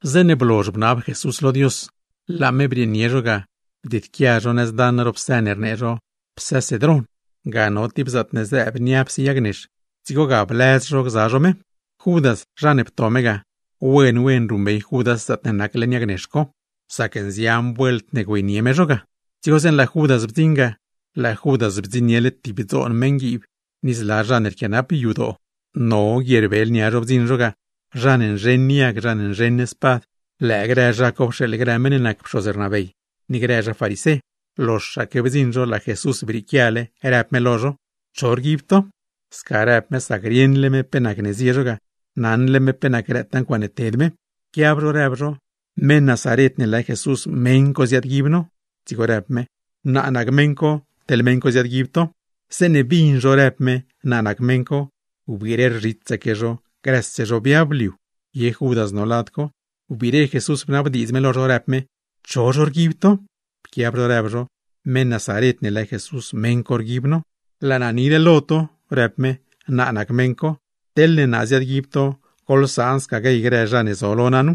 Zeeṉe blozh bnab Jesús lo Dios, laa me brieenie no ga bdieedquia no nëz daṉ ro psë ne rnee zho Psë Cedrón. Ga no tib zaatne zëëb niapse yag nex, dzigo ga bliaaz no gza no me. Judas zha ne pto me ga, wen wen ruṉbey Judas lugar co, sac nzian vuelt ziyenie me no ga. Dzigo zeeṉe laa Judas blanso ga, laa Judas blansoniele tib dzoon meṉguiib, ni zla zha ne rquianap yadoo; no guierbel nia zho blanso zho ga, zha ne nzheṉ yag, zha ne nzheṉgaa spad. (Lëë grë zha co pxeeḻ grë pxoz rnabey, ni grë zha farisé.) Loxaque blanso zho, laa Jesús brieequiale, rëb me lo zho: ―¿Cho rguib to? Sca rëb me sac rieṉle me pe nacne zie zho ga, naṉle me pe nac grëtaa ncuaaṉe ted me. Pquiab zho, rëb zho: ―Meṉ Nazaret ne lë Jesús, meṉ co ziaadguib no. Dzigo rëb me: ―Naa nac meṉ co, teḻ me ziaadguib to. Zeeṉe bin zho rëb me: “Naa nac meṉ co”, wbire rzhitsaque zho, grëse zho biab liu. Ye Judas no lad co. Wbiire Jesús bnabdiidz me lo zho, rëb me: ―¿Cho zho rguib to? Pquiab zho rëb zho: ―Meṉ Nazaret ne lë Jesús, meṉ co rguib no. ―Laa naa nile lo to ―rëb me―. Naa nac meṉ co. Teḻne naa ziaadguib to, goḻsaan sca guey grë zha ne zo lo naa nu.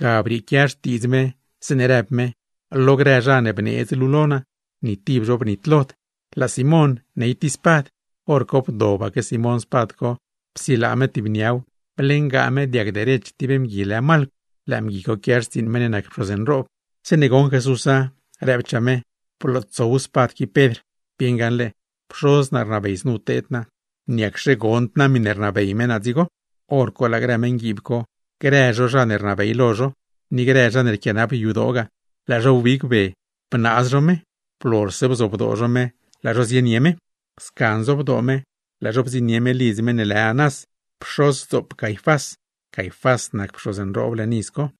Ga brieequia xtiidz me zeeṉe rëb me: “Lo grë zha ne bneedz luu lo naa, ni tib zho bnitlod.” Laa Simón ney tib spad, hor co bdobaque Simón spad co psilaa me tib niaw, bliengaa me diag derech tib mgui lë Malcw. (Lëë mgui co quia xtsiiṉ meṉ ne nac pxoz nroob.) Zeeṉe goṉ Jesúsa, rëbchaa me: ―¡Blootsow spad qui Pedr! ¡Bieṉ gaṉle Pxoz naa rnabey znu teed naa! ¿Niacxe gond naa miṉe rnabey me naa dzigo? Horco laa grë meṉguiib co, grë zho zha ne rnabey lo zho, ni grë zha ne rquianap yadoo ga, laa zho wbigbe bnaaz zho me. Blozhse bzobdoo zho me, laa zho zienie me. Sca nzobdoo me, laa zho bdziṉnie me lidz meṉ ne lë Anás, pxozdzoop Caifás. Caifás nac pxoz nroob leṉ iz co,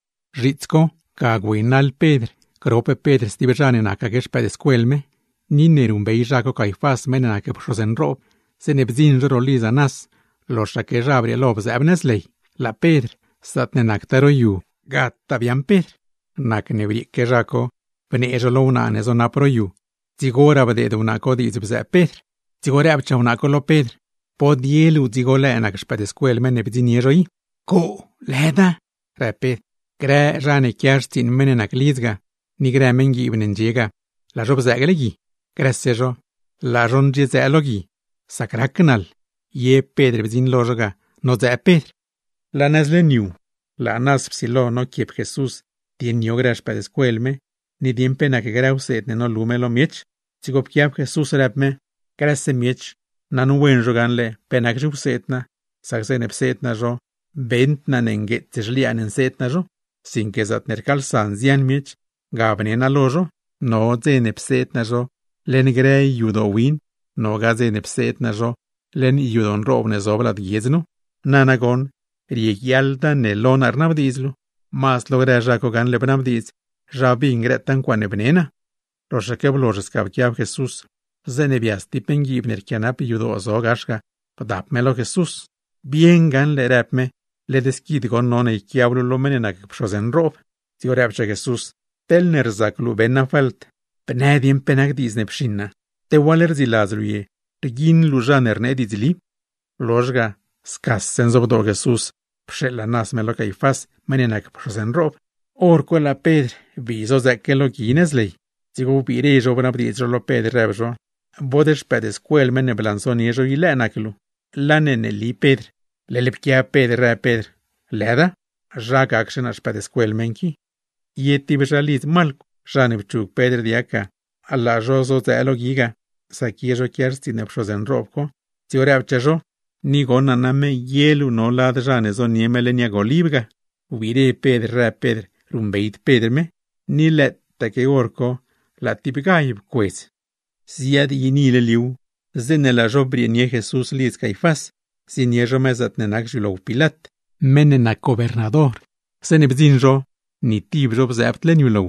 Zhiits co, ga naḻ no grop no Pedr. Ni ne ruṉbey naa Caifás meṉ ne nac pxoz nroob ga, zeeṉe bdziṉ no ro lidz Anás, loxaque naa brieelo bzëëb nëz ley. Laa Pedr, zaatne nactaa ro yu par gdziṉ zaatne nac ley, gataa biaaṉ Pedr. Nacne brieque naa bnee naa lo wnaa ne zonap ro yu, dzigoraa bdeed wnaa co diidz bzëëb Pedr. Dzigo rëbchaa me lo Pedr: ―¿Bod ye luu dzigo lëë nac xpëëdscuel meṉ ne bdziṉnie zho i? ―Coo, led yed naa ―rëb Pedr. Grë zha ne quia xtsiiṉ meṉ co ni grë meṉguiib ne ndxie ga, laa zho bzëëgle gui. Grëse zho, laa zho ndxiedzëë lo gui ga, sac rac naḻ. Ye Pedr bdziṉ lo zho ga nodzëë Pedr. Laa nëz leṉ yu, laa Anás psilo noquiep Jesús dieṉ yo grë xpëëdscuel me, ni dieṉ pe nac grë wseed ne nolu me lo miech. Dzigo pquiab Jesús, rëb me: ―Grëse miech, naṉwen zho gaṉle pe nac zhiwseed naa. Sac zeeṉe pseed naa zho, beṉd naa ne ngueets zhliaan nseed naa zho; sinque zaatne rcaalsa nzian miech, ga bne naa lo zho. No hor pseed naa zho leṉ grë yadoo win, nogaa hor pseed naa zho leṉ yadoo nroob ne zob lad guiedz nu. Nana bod rieguiaḻda ne lo naa rnabdiidz luu. Mazd lo grë zha co gaṉle bnabdiidz, zha bin grëtaa ncuaaṉe bne naa. Loxaque blozh sca pquiab Jesús, zeeṉe bias tib meṉguiib ne rquianap yadoo zo gax ga, bdap me lo Jesús. ―¡Bieṉ gaṉle! ―rëb me―. ¡Led squid goṉ none yquiab luu lo meṉ ne nac pxoz nroob! Dzigo rëbchaa Jesús: ―Teḻne rzac luu beṉ naa falt, bnë dieṉ pe nac diidz ne pxiṉ naa. ¿Te waḻ rdziladz luu ye, rguiṉ luu zha ne rnee diidzli? Blozh ga scaque nzobdoo Jesús pxeeḻ Anás me lo Caifás, meṉ ne nac pxoz nroob. Horco laa Pedr bii zodzëëque lo gui nëz ley. Dzigo wbiire zho bnabdiidz zho lo Pedr, rëb zho: ―¿Bod xpëëdscuel meṉ ne blansonie zho i lëë nac luu? Laane neeli Pedr, leḻ pquiab Pedr rëb Pedr: ―¡Lëda! ¡Zha gaczhe naa xpëëdscuel meṉ qui! Ye tib zhalidz Malcw, zha ne pchug Pedr diag ga, laa zho zodzëë lo gui ga, sac ye zho quia xtsiiṉ pxoz nroob co; dzigo rëbchaa zho: ―Ni goṉ naa name, ye luu no lad zha ne zonie me leṉ yag oliv ga. Wbiire Pedr rëb Pedr ruṉbeyd Pedr me, ni lëëtaque hor co laa tib gall pcuedz. Ziadyiinile liuw, zeeṉe laa zho brieenie Jesús lidz Caifás, zienie zho me zaatne nac xyulow Pilat, meṉ ne nac gobernador. Zeeṉe bdziṉ zho, ni tib zho bzëëbd leṉ yulow,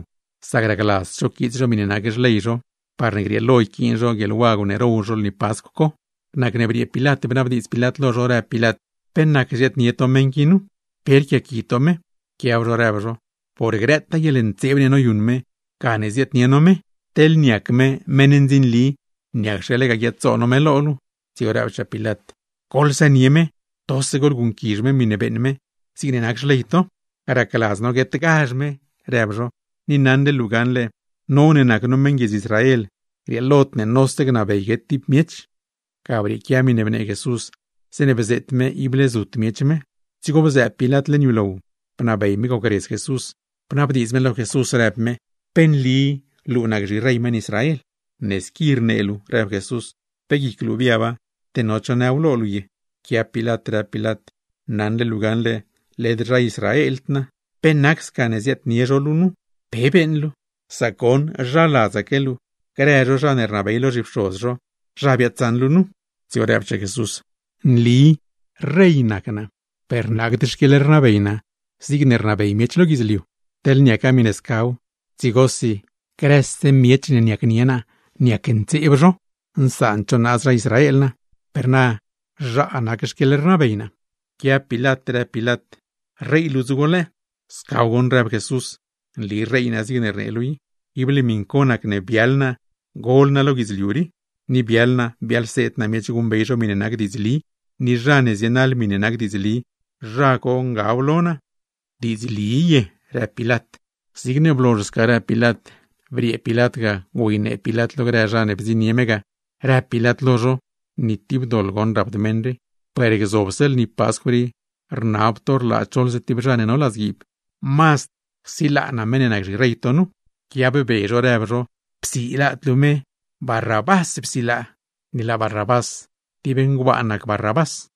sac racladzd zho quiits zho miṉe rnabey xley lay zho; parne grieelo yquiin zho guieḻwagw ne row zho lni Pascw co. Nacne briee Pilat bnabdiidz Pilat lo zho, rëb Pilat: ―¿Pe nacne ziaadnie to meṉ qui nu? ¿Pe rquiaqui to me? Pquiab zho, rëb zho: ―¡Por grëtaa guieḻntseeb ne noyuṉ me, gane ziaadnie no me! ¡Teḻne niac me meṉ ndzinli, niacxe lega guiaad-zo no me lo luu! Dzigo rëbchaa Pilat: ―Goḻsënie me, tose goḻguṉquizh me miṉe beeṉ me; zigne nac xley to. ―Racladz no guetgazh me ―rëb zho―. Ni naṉle luu gaṉle, no ne nac no meṉ Israel, grieelod ne nose gnabey guet tib miech. Ga brieequia miṉe bnee Jesús, zeeṉe bzeet me ible zut miech me. Dzigo bzëëb Pilat leṉ yulow, bnabey me gocredz Jesús. Dzigo bnabdiidz me lo Jesús, rëb me: ―¿Pe nli luu nac zhirey meṉ Israel? ―Ne squi rnee luu ―rëb Jesús―. ¿Pe guic luu biaba, te no cho nëw lo luu ye? Pquiab Pilat, rëb Pilat: ―Naṉle luu gaṉle led zha Israeld naa. ¿Pe nac sca ne ziaadnie zho luu nu? ¿Pe beeṉ luu? Sac goṉ zha ladzaque luu grë zho zha ne rnabey lo zhipxoz zho, zha biaadsaṉ luu nu. Dzigo rëbchaa Jesús: ―Nli rey nac naa, per led lo guidzliu riida, teḻne niaca miṉe lo guidzliu riiw, dzigosi grëse zha ne nacnie naa niacntseeb zho, nsaand zho naaz zha Israel naa. Per na, zhaa zaatne nac naa rey. Pquiab Pilat, rëb Pilat: ―¿Rey luu dzigo lëë? ―Scaw goṉ ―rëb Jesús―, nli rey naa; zigne rnee luu i. Ible miṉ co nacne biaḻ naa gol naa lo guidzliu rii, ni biaḻ naa biaḻseed naa miech guṉbey zho miṉe nac diidzli. Ni zha ne zienaḻ miṉe nac diidzli, zha co ngab lo naa. ―¿Diidzli ye? ―rëb Pilat. Zigne blozh sca rëb Pilat, briee Pilat ga güeynee Pilat lo grë zha ne bdziṉnie me ga, rëb Pilat lo zho: ―Ni tib doḻ goṉ rapd meṉ rii. Per gzobse lni Pascw rii, rnab to rlaa choḻze tib zha ne no ladzguiib. ¿Pe gnë to sca, mazd csilaa naa meṉ ne nac zhirey to nu? Pquiabbe zho, rëb zho: ―¡Csilaad luu me! ¡Mazd psilaa Barrabás! Ni laa Barrabás tib ngbaan nac Barrabás.